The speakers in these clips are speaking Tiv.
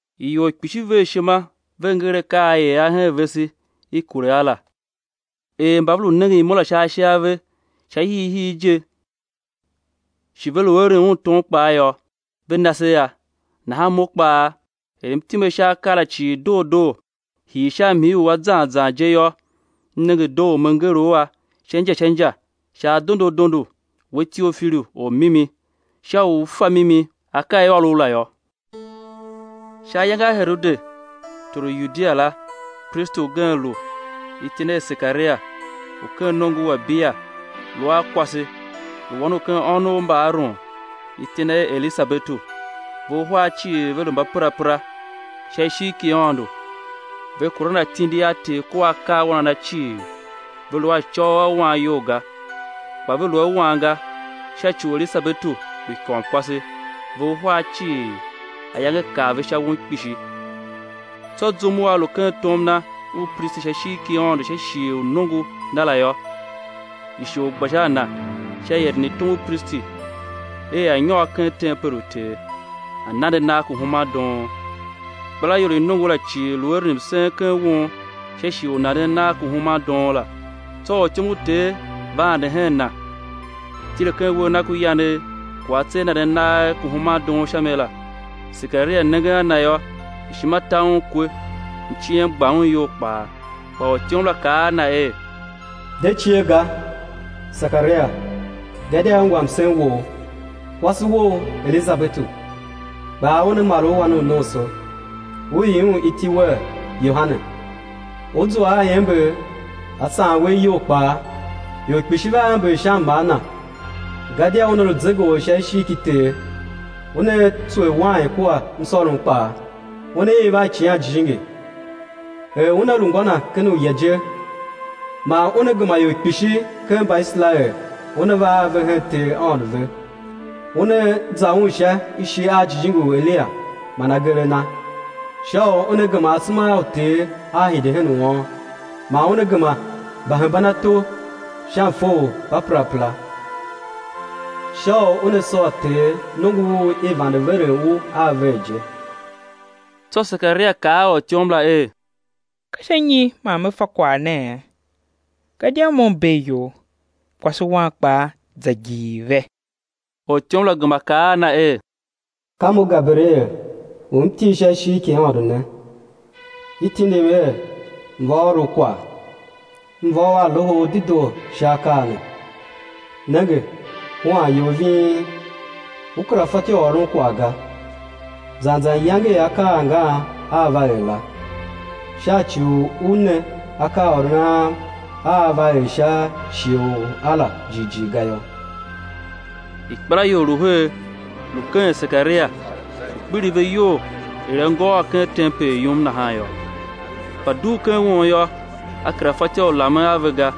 Ior kpishi ver ishima ve nger akaa a i er a hen vese i kure a la, er mba ve lu nengen Imo la sha ashe a ve sha hiihii je shi ve lu eren Un tom kpaa yô, ve na se a la, nahan mo kpaa er m time sha akaa la cii doo doo, hii sha mhii u a zan zan, je yô, m nenge doo u me nger u a sha inja sha inja sha adondo adondo, we Teofilu ormimi, sha u ú fa mimi u akaa a i ôr u la yô. Sha ayange a Herode, tor u Yudia la, pristi ugen lu, iti na er Sekaria, u ken nongo u Abiya; lu a kwase, lu wan u ken ônov mba Aron, iti na er Elisabetu. Ve uhar cii ve lu mbaperapera sha ishigh ki Aôndo, ve kuran atindi a Ter kua akaawan a Na cii ve lu a acôghol a wan iyol ga. Kpa ve lu a wan ga, sha ci u Elisabetu lu ikômkwase; ve uhar cii, ayange kar ve sha won kpishi. Tsô zum u a lu ken tom na u pristi sha ishigh ki Aôndo sha shighe u nongo na la yô, ishor gba sha a na sha ieren i tom u pristi er a̱ nyôr ken tempel u Ter, a̱ nande nagh ku human doon. Ikpelaior i nongo la cii lu eren msen ken won sha shighe u nanden nagh ku human doon la. Tsô ortyom u Ter va ande hen na, tile ken uwegh ku yanegh ku atse a nanden nagh ku human doon sha mi la. Sekaria nengen a na yô, ishima ta un kwe, mciem gba un iyol kpaa. Kpa ortyom la kaa a na er: De cie ga, Sekaria, gadia i ungwa msen wou; kwase wou, Elisabetu, kpaa una mar u wannomso, ú ii un iti wer Yohane. Ú zua a iember á saan we iyol kpaa; ior kpishi vea ember sha mmar na. Gadia una lu zegeor sha ishigh ki Ter; una tswer wain kua msôrom kpaa, una iv a Icighan Jijingi er una lu ngô na ken uya je. Man una gema ior kpishi ken Mbaiserael una va a ve hen Ter Aôndo ve. Una za Un sha ishi a jijingi u Eliya man agee a na, sha u una gema asema a uter a̱ hide hen uôn, man una gema mbahembanato sha mfe u mbaperapera, sha u una sôr Ter nongo u i vande veren u a ver je. Tsô Sekaria kaa a ortyom la er: Ka sha nyi man me fa kwagh nee? Gadia mo m bee iyol, kwase wam kpaa za gigh ve. Ortyom la gema kaa a na er: Ka mo Gaberiel u m til sha ishigh ki Aôndo ne; i tindim er m̱ va ôr u kwagh, m̱ va u a loho u dedoo sha akaa ne. Nenge, huan you ving, ú kera fatyô u ôron kwagh ga, zan zan iyange i akaa angan aa va er la, sha ci u u ne akaaôron am a aa va er sha shighe u a la, jighjigh ga yô. Ikpelaior lu her, lu keghen Sekaria, lu kpiligh ve iyol er a ngôôr ken tempel yum nahan yô, kpa dugh ken won yô, a kera fatyô u lamen a ve ga;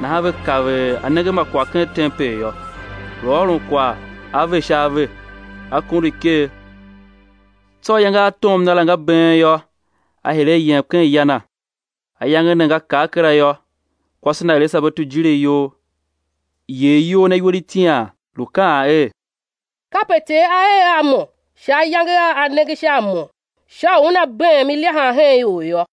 nahan ve kav er a nenge a ma kwagh ken tempel yô. Lu ôron kwagh a ve sha ave, a kondo iker. Tsô ayange a tom na la nga been yô, a hire a yem ken ya na. Ayange ne nga kar kera yô, kwase na Elisabetu jile iyol, yer iyol na iwer itian, lu kaan er: Kape Ter a er a mo sha ayange a A nenge sha a mo sha u Una beem ilyahan hen ior yô.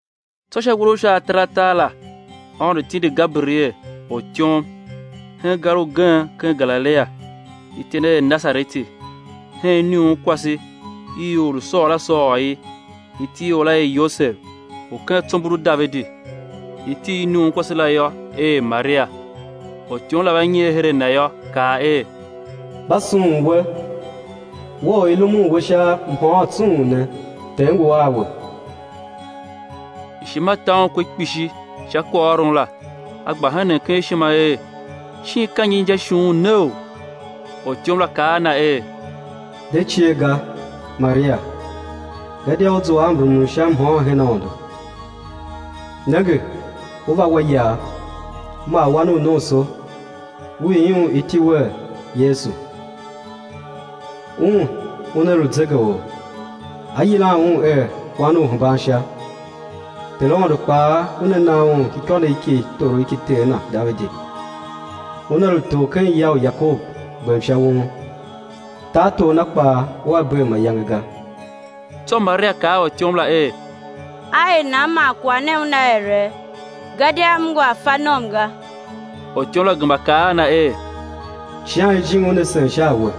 Tsô sha uwer u sha ataratar la Aôndo tindi Gaberiel, ortyom, hen gar ugen ken Galilia, iti na er Nasareti, hen iniunkwase i or lu sôôr a sôôr i; iti i or la er Yosev, u ken tsombor u Davidi; iti i iniunkwase la yô, er Maria. Ortyom la va nyer her a na yô, kaa er: Mba sughun we, we u i rumun we sha mhôôn tsung ne, Ter ngu a we. Ishima ta un kwe kpishi sha kwaghôron la, a gba henen ken ishima er, shin ka nyi inja ishughun neou? Ortyom la kaa a na er: De cie ga, Maria, gadia u zua a mrumun u sha mhôôn her Aôndo. Nenge, ú va wa iyav, ú mar wan u nomso, ú ii Un iti wer Yesu. Un, Una lu Zegeor, á yilan Un er Wan u Uhembansha; Ter Aôndo kpaa Una na Un ikônough ki torough ki Ter Na Davidi. Una lu tor ken ya u Yakob gbem sha won; tartor Na kpaa ua bee mayange ga. Tsô Maria kaa a ortyom la er: Á er nan man kwagh ne una ere, gadia m ngu a fa nom ga? Ortyom la gema kaa a na er: Icighan Jijingi Una sen sha a we,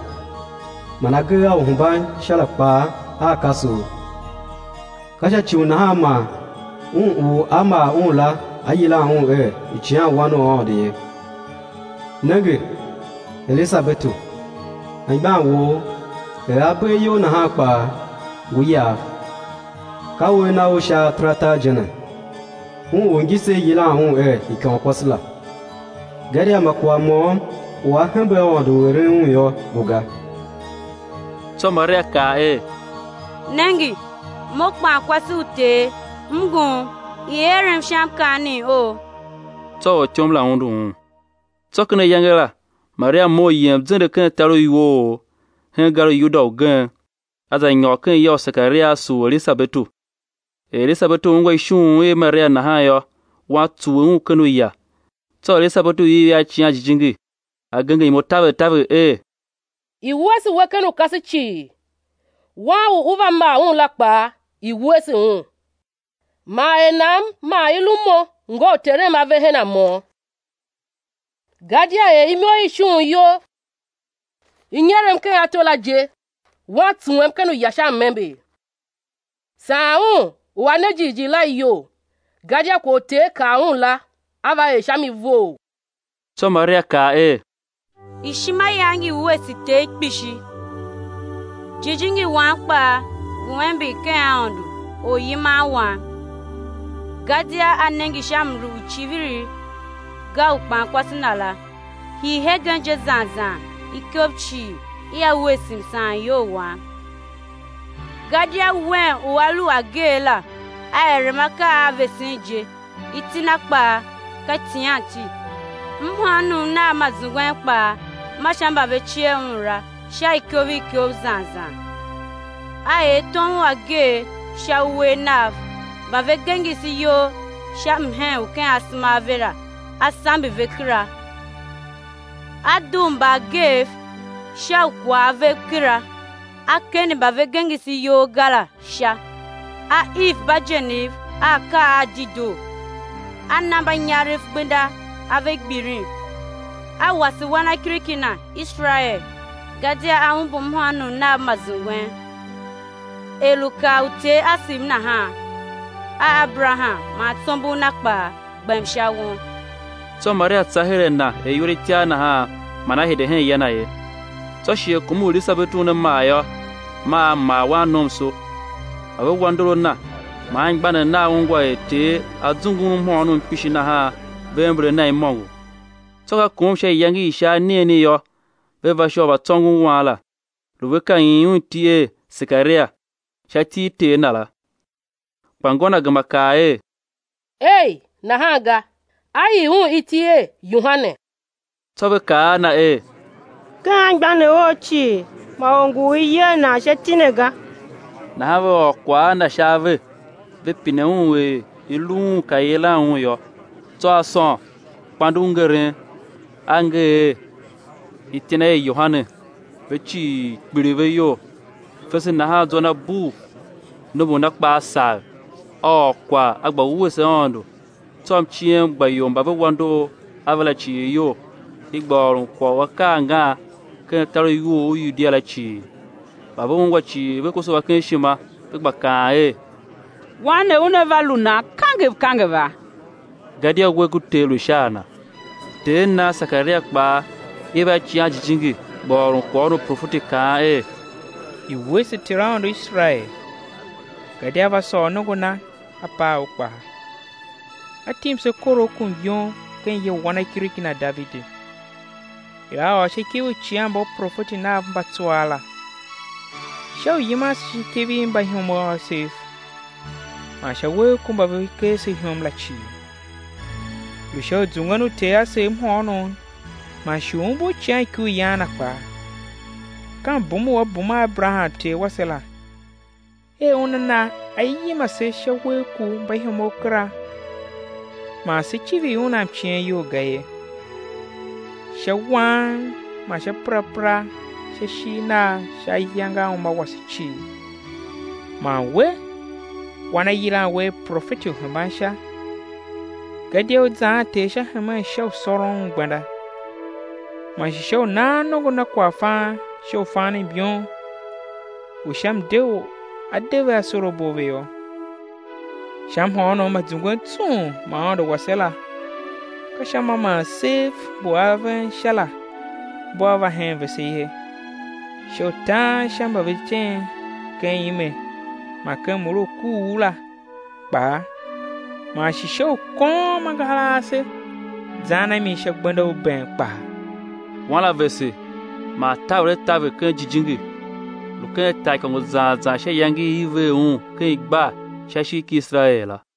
man agee a Uhembansha la kpaa aa kase u; ka sha ci u nahan man Un u á mar Un la á yilan Un er Icighanwan u Aôndo ye. Nenge, Elisabetu, anmgbian wou, er a bee iyol nahan kpaa, ngu iyav, ka uwer na u sha ataratar je ne, un u ngise i yilan un er ikômkwase la. Gadia ma kwagh môm u a hembe Aôndo u eren un yô, ngu ga. Tsô Maria kaa er; Nenge, mo kpankwase u Ter, m ngun; i̱ erem sha mkaanem ou. Tsô ortyom la undu un. Tsô ken ayange la Maria mough yem zende ken tar u iwoogh, hen gar u Yuda ugen. A za nyôr ken ya u Sekaria a sugh Elisabetu. Er Elisabetu ungwa ishughun i Maria nahan yô, wan tsuwe un ken uya; tsô Elisabetu iv a Icighan Jijingi, a genger imo taver taver er: I̱ wuese we ken ukase cii, Wan u ú va mar Un la kpaa i̱ wuese Un. Man er nan man i lu mo ngô u Terem a ve hen mo? Gadia er imo i ishughun you i nyerem ken ato la je, wan tsuwem ken uya sha m-ember. Saan un u a ne jighjigh la, iyol, gadia kwagh u Ter kaa un la, á va er sha mi vough. Tsô Maria kaa er: Ishima yam ngi wuese Ter kpishi, jijingi wam kpaa ngu ember ken Aôndo, Oryiman wam. Gadia A nenge sha mlu u icivirigh ga u kpankwase Na la, hii hegen je zan zan ikov cii ia wuese msaanyol wam; gadia Wen u A lu u ageegh la A erem akaa a vesen je. Iti Na kpaa ka icighanti. Mhôônom Nam ma zungwen kpaa ma sha mba ve cie Un la, sha ikov ikov zan zan. A er tom u ageegh sha uwegh Nagh; mba ve gengese iyol sha mhen u ken asema a ve la, A sambe ve kera. A dugh mbaageev sha ukwav vev kera, A kende mba ve gengese iyol ga la, sha, A iv mbagenev a akaa a dedoo; A na mbanyarev gbenda ave gbilin; A wase wanakiriki Na, Iserael, gadia A umbur mhôônom Nam ma zungwen. Er lu kaa uter asev nahan a Aberaham man tsombor na kpaa, gbem sha won. Tsô Maria tsa her a na er iwer itiar nahan, man a hide hen ya na ye. Tsô shighe kom u Elisabetu una mar yô, maa a mar wannomso. Mba ve wa ndor a na man anmgbianev nav ungwa er Ter A zungu un mhôônom kpishi nahan ve ember a na imôngo. Tsô ka kom sha iyange i sha anigheni yô, ve va sha u va tsôngon wan la; lu ve ka yilan un iti er, Sekaria, sha iti i ter na la. Kpa ngô na gema kaa er: Ei, nahan ga, á yila un iti er, Yohane. Tsô ve kaa a na er: Ken anmgbianev ou cii ma or ngu u i yer nan sha iti ne ga. Nahan ve ôr kwagh a ter na sha ave, ve pine un er i lu un pe i̱ yilan un yô. Tsô a sôn kpande u ngeren, a nger er: Iti na er, Yohane. Ve cii kpiligh ve iyol. Fese nahan zwa na bugh, nombor na kpaa sagh; a ôr kwagh a gba wuese Aôndo. Tsô mciem gba ior mba ve wa ndor a ve la cii iyol; ve gba ôron kwagh u akaa angan ken tar u iwoogh u Yudia la cii. Mba ve ungwa cii ve koso a ken ishima, ve gba kaan er: Wan ne una va lu nan kangev kangeva? Gadia uwegh ku Ter lu sha a na. Ter na, Sekaria kpaa iv a Icighan Jijingi, gba ôron kwaghôron u profeti kaan er: I̱ wuese Ter Aôndo u Iserael; gadia A va sôr nongo Na, A paa u kpaa. A tim se korough ku myom ken ya u wanakiriki Na Davidi, er A ôr sha ikev i uicighanmbaprofeti Nav mba tsuaa la, sha u yiman se sha ikev i mbaihomov asev, man sha uwegh ku mba ve ker se ihom la cii. Lu sha u zungwen uter asev mhôônom, man shi u umbur icighanikuryan Na kpaa; ka mbum u A bum a Aberaham ter wase la, er Una na á yima se sha uwegh ku mbaihomov kera, man sé civir Un a mciem iyol ga ye, sha wang man sha perapera sha ishigh Nagh sha ayange a uma wase cii. Man we, wan á yilan we er profeti u Uhembansha; gadia ú zaan Ter sha hemen sha u sôron Un gbenda, man shi sha u nan nongo Na kwaghfan sha u fan myom u sha mde u á de ve asorabo a ve yô, sha mhôônom ma zungwen tsung ma Aôndo wase la; ka sha ma man sev mbu aven Sha la mbua va hen vese ye, sha u tan sha mba ve tem ken ime man ken mure u kuugh la kpaa, man shi sha u kôôm angahar ase zan a mi sha gbenda u bem kpaa. Wan la vese man taver a taver ken Jijingi; lu ken taaikôngo zan zan sha iyange i i ver un ken igbar sha ishigh ki Iserael la.